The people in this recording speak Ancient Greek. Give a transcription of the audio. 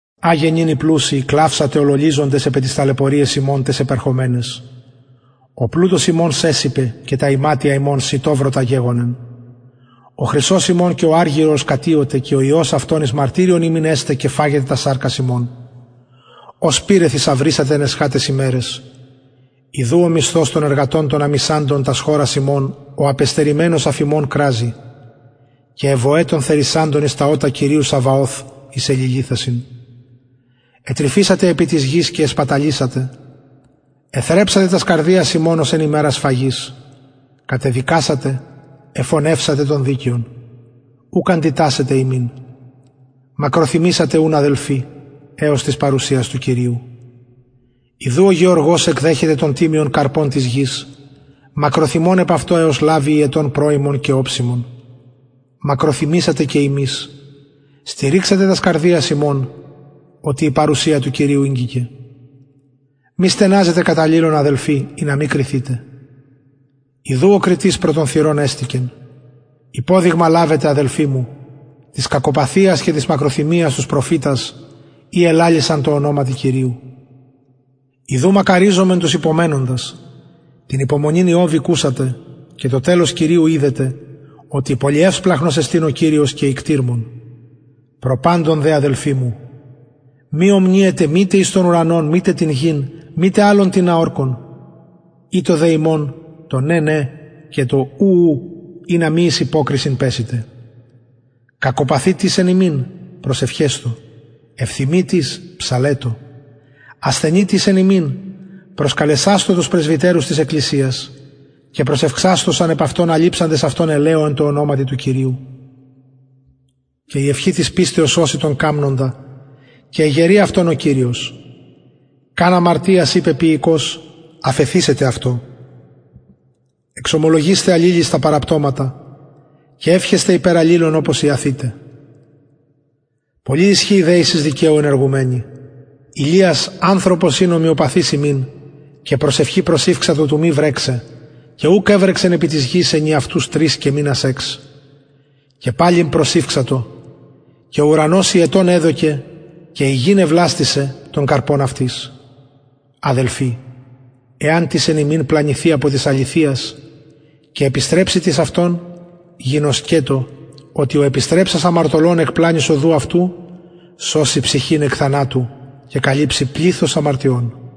αγε νυν οι πλουσιοι κλαυσατε ολολυζοντες επι ταις ταλαιπωριαις υμων ταις επερχομεναις ο πλουτος υμων σεσηπεν και τα ιματια υμων σητοβρωτα γεγονεν ο χρυσος υμων και ο αργυρος κατιωται και ο ιος αυτων εις μαρτυριον υμιν εσται και φαγεται τας σαρκας υμων ως πυρ εθησαυρισατε εν εσχαταις ημεραις ιδου ο μισθος των εργατων των αμησαντων τας χωρας υμων ο απεστερημενος αφ υμων κραζει και αι βοαι των θερισαντων εις τα ωτα κυριου σαβαωθ εισεληλυθασιν ετρυφησατε επι της γης και εσπαταλησατε εθρεψατε τας καρδιας υμων ως εν ημερα σφαγης κατεδικασατε εφονευσατε τον δικαιον ουκ αντιτασσεται υμιν μακροθυμησατε ουν αδελφοι εως της παρουσιας του κυριου ιδου ο γεωργος εκδεχεται τον τιμιον καρπον της γης μακροθυμων επ αυτον εως λαβη υετον πρωιμον και οψιμον μακροθυμησατε και υμεις στηριξατε τας καρδιας υμων οτι η παρουσια του κυριου ηγγικεν μη στεναζετε κατ αλληλων αδελφοι ινα μη κριθητε ιδου ο κριτης προ των θυρων εστηκεν υποδειγμα λαβετε αδελφοι μου της κακοπαθειας και της μακροθυμιας τους προφητας οι ελαλησαν τω ονοματι κυριου ιδου μακαριζομεν τους υπομενοντας την υπομονην ιωβ ηκουσατε και το τελος κυριου ιδετε οτι πολυσπλαγχνος εστιν και οικτιρμων προ παντων δε αδελφοι μου μη ομνυετε μητε τον ουρανον μητε την γην μητε αλλον τινα ορκον ητω δε υμων το ναι ναι και το ου ου ινα μη εις υποκρισιν πεσητε κακοπαθει τις εν υμιν προσευχεσθω ευθυμει τις ψαλλετω ασθενει τις εν υμιν προσκαλεσασθω τους πρεσβυτερους της εκκλησιας και προσευξασθωσαν επ αυτον αλειψαντες αυτον ελαιω εν τω ονοματι του κυριου και η ευχη της πιστεως σωσει τον καμνοντα και εγερει αυτον ο κυριος καν αμαρτιας η πεποιηκως αφεθησεται αυτω εξομολογεισθε αλληλοις τα παραπτωματα και ευχεσθε υπερ αλληλων οπως ιαθητε πολυ ισχυει δεησις δικαιου ενεργουμενη ηλιας ανθρωπος ην ομοιοπαθης ημιν και προσευχη προσηυξατο του μη βρεξαι και ουκ εβρεξεν επι της γης ενιαυτους τρεις και μηνας εξ και παλιν προσηυξατο και ο ουρανος υετον εδωκεν και η γη εβλαστησεν τον καρπον αυτης αδελφοι εαν τις εν υμιν πλανηθη απο της αληθειας και επιστρεψη τις αυτον γινωσκετω οτι ο επιστρεψας αμαρτωλον εκ πλανης οδου αυτου σωσει ψυχην εκ θανατου και καλυψει πληθος αμαρτιων